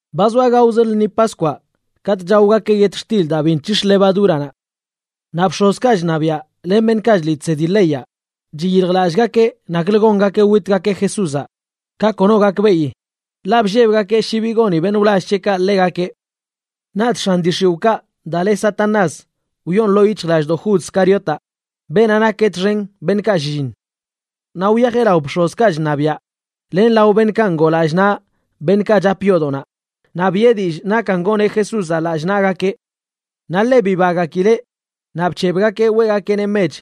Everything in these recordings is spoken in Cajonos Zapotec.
Ba zoa gaozə lṉi Paskwaꞌ katꞌ chaogakeꞌ yetxtil daa bi nc̱hix̱ levadúranaꞌ. Naꞌ bx̱ozkaꞌ chṉabiaꞌ len beṉꞌkaꞌ chliꞌ chsedi leyaꞌ chiyiljlallꞌgakeꞌ naklə gongakeꞌ witgakeꞌ Jesúzaꞌ ka kono gakbeꞌi, ḻaꞌ bllebgakeꞌ shi bi goni beṉꞌ wlall c̱heꞌkaꞌ ḻegakeꞌ. Naꞌch x̱an dii x̱iwꞌkaꞌ daa le Satanás wyoon ḻoo yic̱hjlallꞌdoꞌ Jud Scariotaꞌ, beenaꞌ nak txen beṉꞌkaꞌ shlliṉ. Naꞌ wyajeꞌ lao bx̱ozkaꞌ chṉabiaꞌ len lao beṉꞌkaꞌ ngoo lallꞌ naꞌ beṉꞌkaꞌ chap yoodoꞌnaꞌ, naꞌ biꞌe dillꞌ nakan goneꞌ Jesúzaꞌ lallꞌ naꞌgakeꞌ. Naꞌ ḻe bibagakileꞌ naꞌ bc̱hebgakeꞌ weꞌgakeꞌneꞌ mech.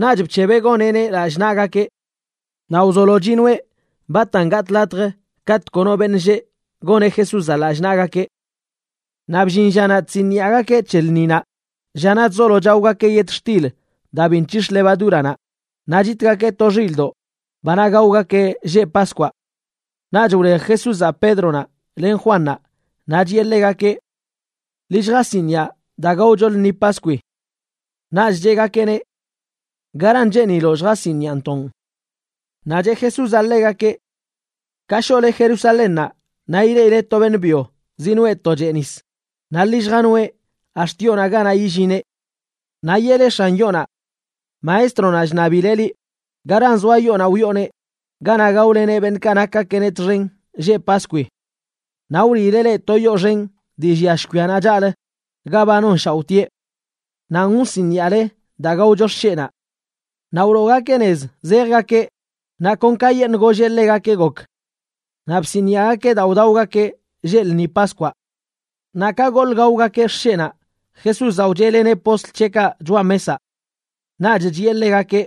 Naꞌch bc̱hebeꞌ goneꞌneꞌ lallꞌ naꞌgakeꞌ. Naꞌ wzolo chinoeꞌ batan gatꞌ latj katꞌ kono beṉꞌ lleꞌ goneꞌ Jesúzaꞌ lallꞌ naꞌgakeꞌ. Naꞌ bllin llanaꞌ chsiniꞌagakeꞌ c̱he lṉinaꞌ, llanaꞌ chzolo chaogakeꞌ yetxtil daa biꞌ nc̱hix̱ levadúranaꞌ naꞌ chitgakeꞌ to xilꞌdoꞌ, banaꞌ gaogakeꞌ lleꞌ Paskwaꞌ. Naꞌch wlej Jesúzaꞌ Pédronaꞌ len Juannaꞌ naꞌ chiꞌe ḻegakeꞌ: ―Ḻi lljasiniꞌa daa gaocho lṉi Paskwi. Naꞌch cheꞌgakeꞌneꞌ: ―¿Garan cheeniloꞌ lljasiniꞌantoꞌn? Naꞌ cheꞌ Jesúzaꞌ ḻegakeꞌ: ―Ka shoꞌle Jerusalénnaꞌ, naꞌ ileꞌile to beṉꞌ byo zinoꞌe to chee nis, naꞌ ḻi lljanoeꞌ ax̱t yoonaꞌ ganaꞌ yillineꞌ. Naꞌ yeꞌle x̱an yoonaꞌ: “Maestronaꞌ chṉabileꞌ liꞌ: ¿Garan zoa yoonaꞌ wyooneꞌ ganaꞌ gaoleneꞌ beṉꞌkaꞌ nakgakeꞌneꞌ txen lleꞌ Paskwi?” Naꞌ wliileꞌ leꞌ to yoo xen dii llia shkwianaꞌ chaꞌlə ga ba nonshaoꞌtieꞌ. Nanꞌ wsiniꞌale daa gaocho xsheꞌnaꞌ. Naꞌ wloogakeꞌ nez zejgakeꞌ, naꞌ kon kayeṉꞌ golleꞌ ḻegakeꞌ gok. Naꞌ bsiniꞌagakeꞌ daa wdaogakeꞌ lleꞌ lṉi Paskwaꞌ. Naꞌ ka goḻꞌ gaogakeꞌ xsheꞌnaꞌ, Jesúzaꞌ wcheꞌleneꞌ postl c̱heꞌkaꞌ choꞌa mesaꞌ. Naꞌch chiꞌe ḻegakeꞌ: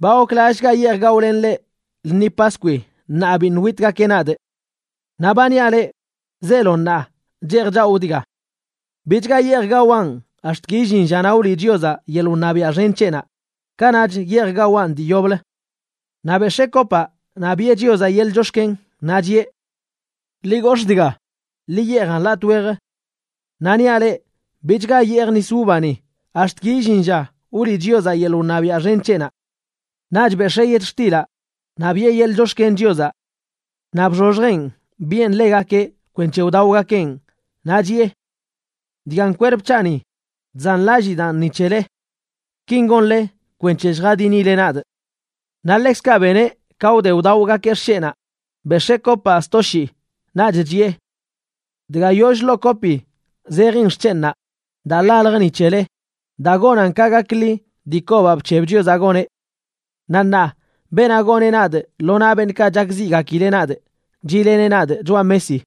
―Ba goklallꞌchgaꞌ yeej gaolenꞌ leꞌ lṉi Paskwi ṉaa biṉꞌ witgakeꞌ nadꞌ. Naꞌ ba niaꞌ leꞌ, zeelo ṉaa cheej chawꞌ dga. Bichga yeej gawaꞌn ax̱t ki illin llanaꞌ wliꞌ Chiozaꞌ yeḻꞌ wṉabiaꞌ xen c̱heꞌnaꞌ, kanaꞌch yeej gawaꞌn dii yoblə. Naꞌ bex̱ee kopaꞌ naꞌ biꞌe Chiozaꞌ yeḻꞌ chox̱ken, naꞌ chiꞌe: ―Ḻi gox̱ꞌ dga, ḻi yeejan latꞌ wej. Naꞌ niaꞌ leꞌ, bichga yeejꞌ nis uvani ax̱t ki illin lla wliꞌ Chiozaꞌ yeḻꞌ wṉabiaꞌ xen c̱heꞌnaꞌ. Naꞌch bex̱ee yetxtilaꞌ naꞌ biꞌe yeḻꞌ chox̱ken Chiozaꞌ. Naꞌ bxoxjeꞌn biꞌen ḻegakeꞌ kwenc̱he wdaogakeꞌn, naꞌ chiꞌe: ―Dgan kwerp c̱haꞌni, chzanlallidaan ni c̱hele. Kin gonle kwenc̱he lljadinile nadꞌ. Naꞌ ḻekzkaꞌ beneꞌ ka wde wdaogakeꞌ xsheꞌnaꞌ, bex̱ee kopaꞌ sto shii, naꞌch chiꞌe: ―Dga yoll ḻoo kopi zejin xc̱henꞌnaꞌ daa ḻaljə ni c̱hele daa gonan ka gakḻi dii kobaꞌ bc̱heb Chiozaꞌ goneꞌ. ’Naꞌ ṉaa, beenaꞌ goneꞌ nadꞌ lo naꞌ beṉꞌkaꞌ chakziꞌgakileꞌ nadꞌ chiꞌleneꞌ nadꞌ choꞌa mesi.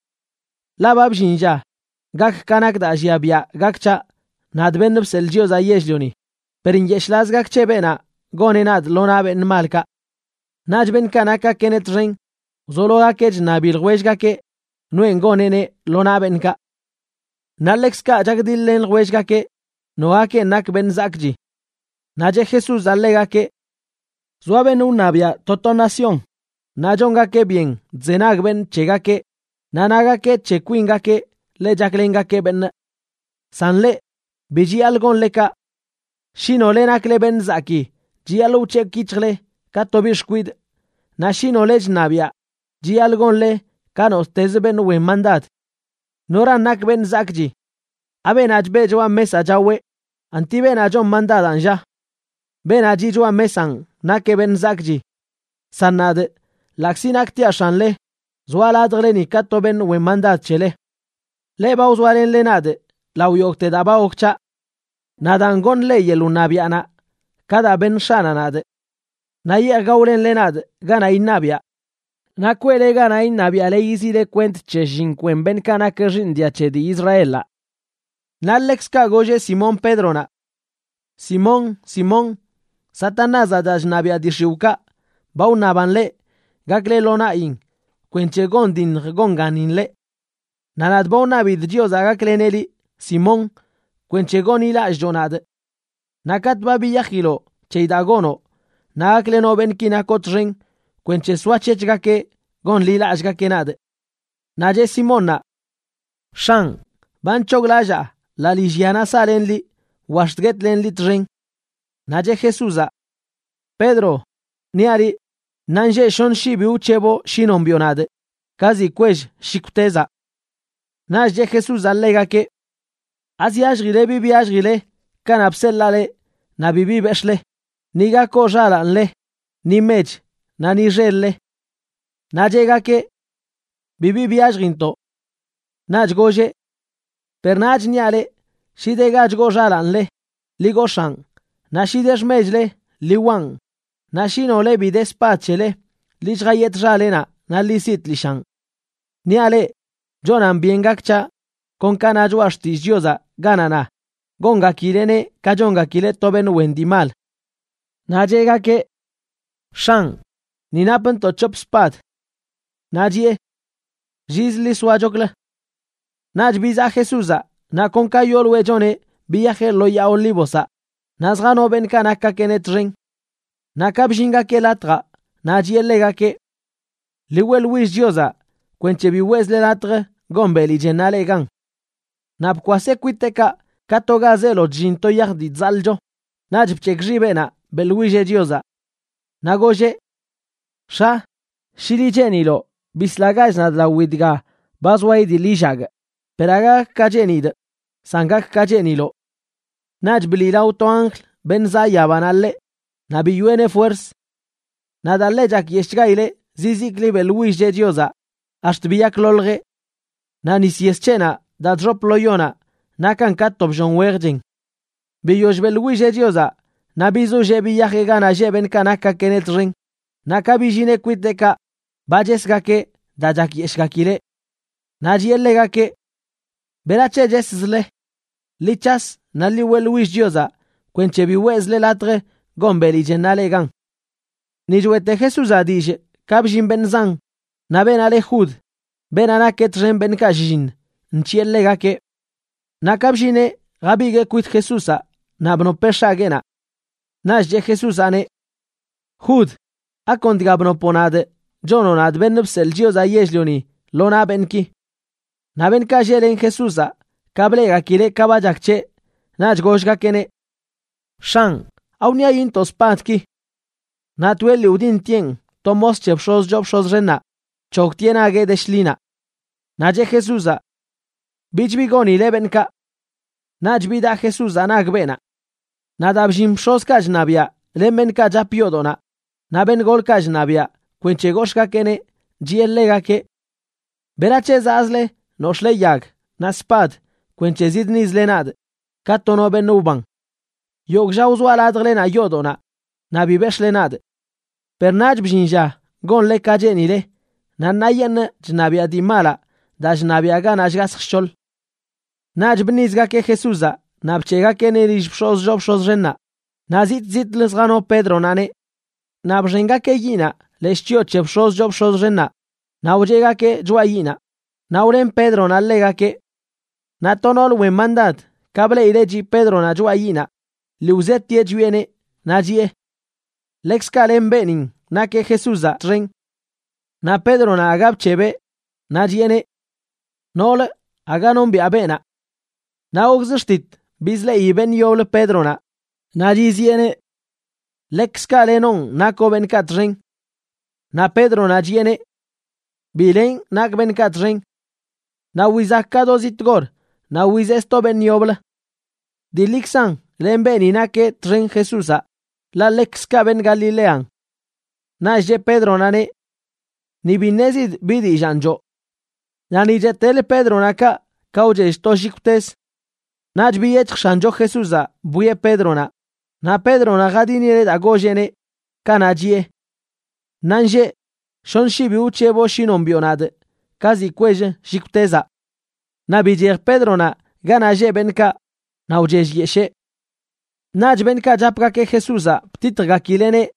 Ḻaꞌ ba bllin lla gak ka nak daa llia biaꞌ gak c̱haꞌ, nadꞌ, Beṉꞌ Bseḻꞌ Chiozaꞌ Yell-lioni, per ¡nyeshꞌlaz gak c̱he beenaꞌ goneꞌ nadꞌ lo naꞌ beṉꞌ malkaꞌ! Naꞌch beṉꞌkaꞌ nakgakeꞌneꞌ txen wzologakeꞌ chṉabi ljwellgakeꞌ noenꞌ goneꞌneꞌ lo naꞌ beṉꞌkaꞌ. Naꞌ ḻekzkaꞌ chakdiḻ-len ljwellgakeꞌ nogakenꞌ nak beṉꞌ zakꞌchi. Naꞌ cheꞌ Jesúzaꞌ ḻegakeꞌ: ―Zoa beṉꞌ wṉabiaꞌ to to nación, naꞌ chongakeꞌ byen chzenag beṉꞌ c̱hegakeꞌ, naꞌ nagakeꞌ c̱he kwingakeꞌ ḻe chaklengakeꞌ beṉꞌ. San leꞌ, bi chiyaḻꞌ gonle kaꞌ. Shi nole nakle beṉꞌ zakii, chiyaḻꞌ wc̱hekꞌ yic̱hjle ka to biꞌ xkwidꞌ, naꞌ shi nole chṉabiaꞌ, chiyaḻꞌ gonle ka nottezə beṉꞌ wen mandad. ¿Noran nak beṉꞌ zakꞌchi?, ¿abeenaꞌ chbeꞌ choꞌa mesaꞌ chaweꞌ?, ¿anti beenaꞌ chon mandadanꞌ, lla? Beenaꞌ chiꞌ choꞌa mesanꞌ nakeꞌ beṉꞌ zakꞌchi. San nadꞌ, ḻaꞌkzi naktiaꞌ x̱anle, zoaꞌ ladjleni ka to beṉꞌ wen mandad c̱hele. ’Leꞌ ba wzoalenle nadꞌ lao yogꞌte daa ba gok c̱haꞌ. Naꞌ daan, goṉꞌ leꞌ yeḻꞌ wṉabiaꞌnaꞌ ka daa beṉ X̱aꞌnaꞌ nadꞌ. Naꞌ yeej gaolenle nadꞌ ganaꞌ iṉabiꞌa. Naꞌ kweꞌle ganaꞌ iṉabiaꞌle yiziꞌle kwent c̱he shlliṉ kwen beṉꞌkaꞌ nak xiiṉ dia c̱he dii Israelaꞌ. Naꞌ ḻekzkaꞌ golleꞌ Simón Pédronaꞌ: ―Simón, Simón, Satanázaꞌ, daa chṉabiaꞌ dii x̱iwꞌkaꞌ, ba wṉaban leꞌ gakle lo naꞌyin kwenc̱he gondinj gonganin leꞌ. Naꞌ nadꞌ ba wṉabidꞌ Chiozaꞌ gakleneꞌ liꞌ, Simón, kwenc̱he gonḻilallꞌcho nadꞌ. Naꞌ katꞌ ba biyajiloꞌ c̱heyi daa gonoꞌ, naꞌ gaklenoꞌ beṉꞌki nakoꞌ txen kwenc̱he soac̱hec̱hgakeꞌ gonḻilallꞌgakeꞌ nadꞌ. Naꞌ cheꞌ Simónnaꞌ: ―X̱anꞌ, ba nc̱hoglallaa ḻaa lillyanaꞌ saꞌlenꞌ liꞌ wa ax̱t guetlenꞌ liꞌ txen. Naꞌ cheꞌ Jesúzaꞌ: ―Pedro, niaꞌ liꞌ, ṉaanlleꞌ shoṉ shii bi wc̱heboꞌ shi nombiꞌo nadꞌ ka ziꞌ kwell shikwtezaꞌ. Naꞌch cheꞌ Jesúzaꞌ ḻegakeꞌ: ―¿Azyalljile bi byalljile kanaꞌ bseḻaa leꞌ naꞌ bibi bex̱ꞌle, ni ga koo xalaanle, ni mech naꞌ ni xel-le? Naꞌ cheꞌgakeꞌ: ―Bibi byalljintoꞌ. Naꞌch golleꞌ: ―Per ṉaach niaꞌ leꞌ, shi de ga chgoo xalaanle, ḻi gox̱aan, naꞌ shi de xmechle, ḻi waꞌn; naꞌ shi nole bi de spad c̱hele, ḻi lljayetꞌ xalenaꞌ naꞌ ḻi siꞌ tlishaꞌn. Niaꞌ leꞌ, chonan byen gak c̱haꞌ kon ka na Choꞌa Xtillꞌ Chiozaꞌ ganaꞌ na: “Gongakileꞌneꞌ ka chongakileꞌ to beṉꞌ wen dii mal.” Naꞌ cheꞌgakeꞌ: ―X̱anꞌ, ni napntoꞌ c̱hop spad. Naꞌ chiꞌe: ―Lliz ḻi soachoklə. Naꞌch bizaꞌ Jesúzaꞌ, naꞌ kon ka yooloeꞌ choneꞌ biyajeꞌ lo Yaa Olívozaꞌ, naꞌ zjano beṉꞌkaꞌ nakgakeꞌneꞌ txen. Naꞌ ka bllingakeꞌ latjaꞌ, naꞌ chiꞌe ḻegakeꞌ: ―Ḻi weꞌḻwill Chiozaꞌ kwenc̱he bi weꞌzle latj gon beli chennaꞌ leꞌ gan. Naꞌ bkwaseꞌ kwiteꞌkaꞌ, ka to ga zeelo chllin to yaj dii chzaḻꞌcho, naꞌch bc̱hekꞌ xibeꞌnaꞌ beꞌḻwilleꞌ Chiozaꞌ. Naꞌ golleꞌ: ―X̱a, shi liꞌ cheeniloꞌ, bislagach nadꞌ lawi dga ba zoa idiḻ illagꞌ; per aga gak ka cheenidꞌ, san gak ka cheeniloꞌ. Naꞌch bliꞌlao to anjl beṉꞌ zaꞌ yabanaꞌ ḻeꞌ, naꞌ biyoꞌeneꞌ fuerz. Naꞌ daa ḻe chakyeshꞌchgaileꞌ, zizikli beꞌḻwillcheꞌ Chiozaꞌ ax̱t biyakloljeꞌ. Naꞌ nis yes c̱heꞌnaꞌ daa chxop lo yonaꞌ nakan ka to bllon wej chen. Biyoll beꞌḻwilleꞌ Chiozaꞌ, naꞌ bizollee biyajeꞌ ganaꞌ lleꞌ beṉꞌkaꞌ nakgakeꞌneꞌ txen, naꞌ ka billineꞌ kwiteꞌkaꞌ ba chesgakeꞌ daa chakyeshꞌgakileꞌ. Naꞌ chiꞌe ḻegakeꞌ: ―¿Berac̱he cheszle? Ḻi c̱has naꞌ ḻi weꞌḻwill Chiozaꞌ kwenc̱he bi weꞌzle latj gon beli chennaꞌ leꞌ gan. Ni choeꞌte Jesúzaꞌ dillꞌ, ka bllin beṉꞌ zan, naꞌ beenaꞌ le Jud, beenaꞌ nak txen beṉꞌkaꞌ shlliṉ, nc̱hiꞌe ḻegakeꞌ. Naꞌ ka bllineꞌ jabiguee kwit Jesúzaꞌ naꞌ bnopeꞌ x̱agueenaꞌ. Naꞌch cheꞌ Jesúzaꞌneꞌ: ―Jud, ¿akon dga bnopoꞌ nadꞌ chonoꞌ nadꞌ, Beṉꞌ Bseḻꞌ Chiozaꞌ Yell-lioni, lo naꞌ beṉꞌki? Naꞌ beṉꞌkaꞌ lleꞌlen Jesúzaꞌ, ka bleꞌgakileꞌ ka ba chak c̱heꞌ, naꞌch gollgakeꞌneꞌ: ―X̱anꞌ, ¿awṉiayintoꞌ spadki? Naꞌ toeꞌ lii wdintieꞌn to mos c̱he bx̱oz choo bx̱oz xennaꞌ bc̱hogtieꞌ nagueꞌ de shḻinaꞌ. Naꞌ cheꞌ Jesúzaꞌ: ―Bich bi gonile beṉꞌkaꞌ. Naꞌch bidaꞌ Jesúzaꞌ nag beenaꞌ. Naꞌ daa bllin bx̱ozkaꞌ chṉabiaꞌ len beṉꞌkaꞌ chap yoodoꞌnaꞌ, naꞌ beṉꞌ golkaꞌ chṉabiaꞌ, kwenc̱he gox̱ꞌgakeꞌneꞌ, chiꞌe ḻegakeꞌ: ―¿Berac̱he zaꞌzle nox̱ꞌle yag naꞌ spad kwenc̱he zidṉizle nadꞌ ka to no beṉꞌ wban? Yogꞌ lla wzoaꞌ ladjlenaꞌ yoodoꞌnaꞌ naꞌ bi bex̱ꞌle nadꞌ. Per ṉaach bllin lla gonle ka cheenile naꞌ ṉaayeṉꞌ chṉabiaꞌ dii malaꞌ daa chṉabiaꞌ ganaꞌ shgasj shc̱hoḻ. Naꞌch bṉizgakeꞌ Jesúzaꞌ naꞌ bc̱heꞌgakeꞌneꞌ lill bx̱oz choo bx̱oz xennaꞌ, naꞌ zitꞌ zitꞌlə zjano Pédronaꞌneꞌ. Naꞌ bxengakeꞌ yiꞌnaꞌ leshꞌ chyoo c̱he bx̱oz choo bx̱oz xennaꞌ naꞌ wcheꞌgakeꞌ choꞌa yiꞌnaꞌ, naꞌ wlen Pédronaꞌ ḻegakeꞌ. Naꞌ to noolə wen mandad, ka bleꞌileꞌ chiꞌ Pédronaꞌ choꞌa yiꞌnaꞌ, lii wzetieꞌ chwieꞌneꞌ, naꞌ chiꞌe: ―Ḻekzkaꞌ len beenin nakeꞌ Jesúzaꞌ txen. Naꞌ Pédronaꞌ aga bc̱hebeꞌ, naꞌ chiꞌeneꞌ: ―Noolə, aga nombiꞌa beenaꞌ. Naꞌ gokzə xtit bizleꞌi beṉꞌ yoblə Pédronaꞌ naꞌ chiziꞌeneꞌ: ―Ḻekzkaꞌ lenonꞌ nakoꞌ beṉꞌkaꞌ txen. Naꞌ Pédronaꞌ chiꞌeneꞌ: ―Bi lenꞌ nakꞌ beṉꞌkaꞌ txen. Naꞌ wizak ka do ziꞌ tgor naꞌ wizeꞌ sto beṉꞌ yoblə: ―Dii ḻikzan len beeni nakeꞌ txen Jesúzaꞌ ḻaꞌ ḻekzkaꞌ beṉꞌ Galilean. Naꞌch cheꞌ Pédronaꞌneꞌ: ―¡Ni bi ṉezidꞌ bi dillaan choo! Naꞌ ni cheꞌtelə Pédronaꞌ kaꞌ, ka wchell to shikwtez. Naꞌch biyec̱hj X̱ancho Jesúzaꞌ bwieꞌ Pédronaꞌ, naꞌ Pédronaꞌ jadinileꞌ daa golleꞌneꞌ, kanaꞌ chiꞌe: “Ṉaanlleꞌ shoṉ shii bi wc̱heboꞌ shi nombiꞌo nadꞌ ka ziꞌ kwell shikwtezaꞌ.” Naꞌ bichej Pédronaꞌ ganaꞌ lleꞌ beṉꞌkaꞌ naꞌ wchellyeshee. Naꞌch beṉꞌkaꞌ chapgakeꞌ Jesúzaꞌ btitjgakileꞌneꞌ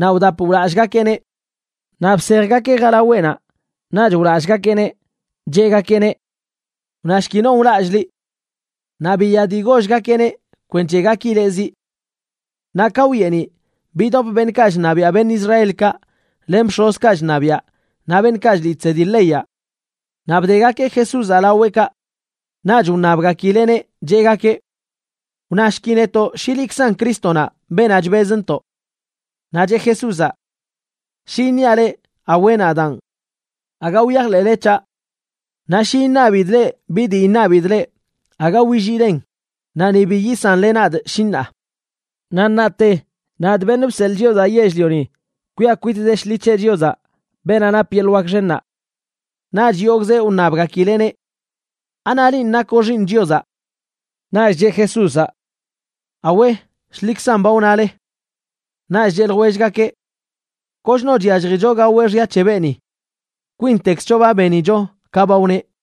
naꞌ wdapꞌ wlallꞌgakeꞌneꞌ. Naꞌ bsejgakeꞌ jalaweꞌnaꞌ, naꞌch wlallꞌgakeꞌneꞌ, cheꞌgakeꞌneꞌ: ―¡Wnashki non wlallꞌ liꞌ! Naꞌ biya dii gollgakeꞌneꞌ kwenc̱he gakileꞌ ziꞌ. Naꞌ ka wyeeniꞌ, bidop beṉꞌkaꞌ chṉabiaꞌ beṉꞌ Israelkaꞌ, len bx̱ozkaꞌ chṉabiaꞌ naꞌ beṉꞌkaꞌ chliꞌ chsedi leyaꞌ. Naꞌ bdegakeꞌ Jesúzaꞌ laweꞌkaꞌ. Naꞌch wṉabgakileꞌneꞌ, cheꞌgakeꞌ: ―Wnashki netoꞌ shi liꞌkzan Crístonaꞌ, beenaꞌ chbezntoꞌ. Naꞌ cheꞌ Jesúzaꞌ: ―Shi iṉiaꞌ leꞌ: “Awe, nadaan”, aga wyajḻeꞌle c̱haꞌ. Naꞌ shi iṉabidꞌ leꞌ bi dii iṉabidꞌ leꞌ, aga williilen naꞌ ni bi yisanle nadꞌ, shi ṉaa. Naꞌ ṉaate, nadꞌ, Beṉꞌ Bseḻꞌ Chiozaꞌ Yell-lioni, kwiꞌa kwit de shḻi c̱he Chiozaꞌ, beenaꞌ nap yeḻꞌ wak xennaꞌ. Naꞌch yogꞌzeꞌ wṉabgakileꞌneꞌ: ―¿Anaꞌ linꞌ nakoꞌ Xiiṉ Chiozaꞌ? Naꞌch cheꞌ Jesúzaꞌ: ―Awe, shḻikzan ba wnale. Naꞌch cheꞌ ljwellgakeꞌ: ―Kochno chyalljicho gaweꞌ xya c̱he beeni. Kwintekzcho ba benicho ka ba wneꞌ.